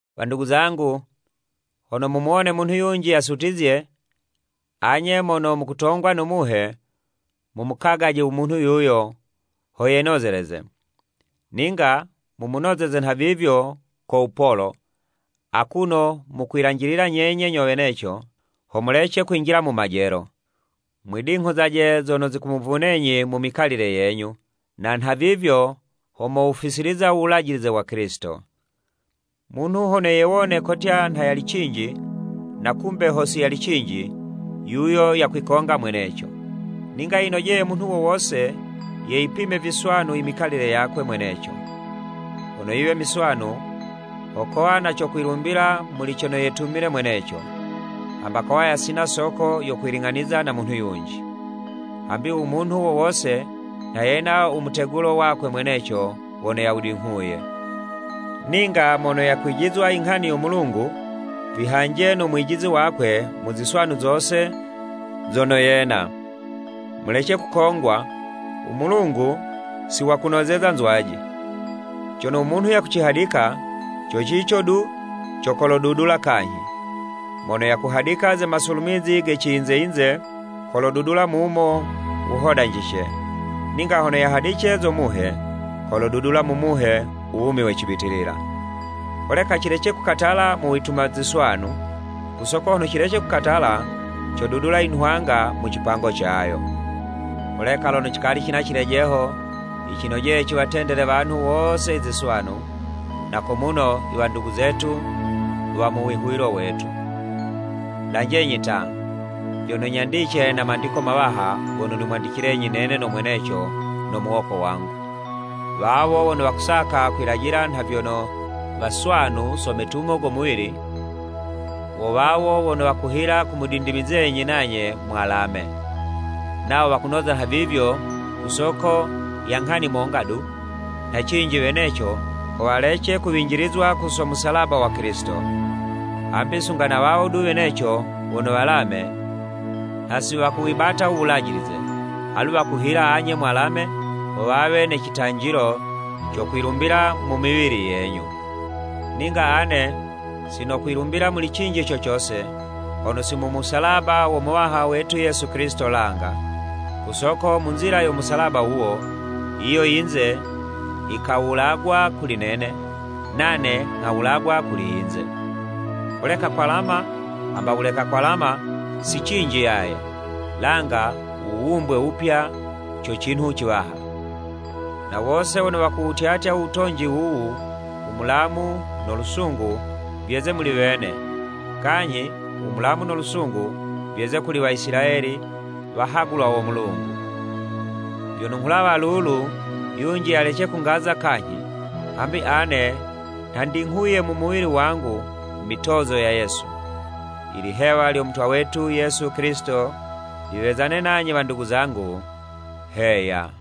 Wandugu zangu, hono mumuwone munhu yunji yasutizye, anye mono mukutongwa no Muhe, mumukagaje u munhu yuyo ho yenozeleze, ninga mumunozeze nhavivyo ko wupolo, akuno mukwilanjilila nyenye nyo weneco ho mulece kwinjila mu majelo. Mwidinghuzaje zono zikumuvunenyi mu mikalile yenyu, na nhavivyo, ho mowufisiliza u Wulajilize wa Kilisito. Munhu hono yewone kotya nha yali cinji, na kumbe ho si yali cinji, yuyo yakwikonga mweneco. Ninga yinojeye munhu wo wose yeyipime viswanu i mikalile yakwe mweneco. Hono yiwe miswanu, ho kowa na co kwilumbila muli cono yetumile mweneco, hamba kowa yasina soko yo kwiling'aniza na munhu yunji. Hambi u munhu wo wose nha yena u mutegulo wakwe mweneco wono yawudinghuye. Ninga mono yakwijizwa i nghani yo Mulungu, vihanje no mwijizi wakwe mu ziswanu zose zono yena. Mulece kukongwa, u Mulungu si wakunozeza nzwaji. Cono u munhu yakucihadika, co cico du co kolodudula kanyhi. Mono yakuhadika ze masulumizi ge ciyinze-yinze, kolodudula mumo wuhodanjice, ninga hono yahadice zo Muhe, kolodudula mu Muhe u wumi we cibitilila. Holeka cilece kukatala mu wituma ziswanu, ku soko hono cilece kukatala, codudula i nhwanga mu cipango cayo. Holeka lono cikali cina cilejeho, yicinojeye ciwatendele wanhu wose i ziswanu, na ko muno i wandugu zetu wa mu wihuwilo wetu. Lanjenyi ta, vyono nyandice na mandiko mawaha gono nimwandicilenyi nene no mweneco no muwoko wangu. Wawo wono wakusaka kwilajila nha vyono waswanu so metumo go muwili, wo wawo wono wakuhila kumudindimizenyi nanye mwalame. Nawo wakunoza nhavivyo ku soko ya nghani monga du, nha cinji weneco ho walece kuwinjilizwa ku so musalaba wa Kilisito. Hambi sunga na wawo du weneco wono walame, nha si wakuwibata u Wulajilize, alu wakuhila anye mwalame ho wawe ne citanjilo co kwilumbila mu miwili yenyu. Ninga ane si nokwilumbila muli cinji co cose, hono si mu musalaba wo Muwaha wetu Yesu Kilisito langa, ku soko mu nzila yo musalaba wuwo, yiyo yinze yikawulagwa kuli nene, nane nghawulagwa kuli yinze. Holeka kwalama hamba wuleka kwalama si cinji yaye, langa u wuwumbwe wupya co cinhu ciwaha. Na wose wono wakuwutyatya u wotonji wuwu, u mulamu no lusungu vyeze muli wene, kanyhi u mulamu no lusungu vyeze kuli Waisilayeli i wahagulwa wo Mulungu. Vyono nghulawa lulu, yunji yalece kungaza kanyhi, hambi ane nha ndinghuye mu muwili wangu mitozo ya Yesu. Ilihewa lyo Mutwa wetu Yesu Kilisito liwezane nanye wandugu zangu. Heya.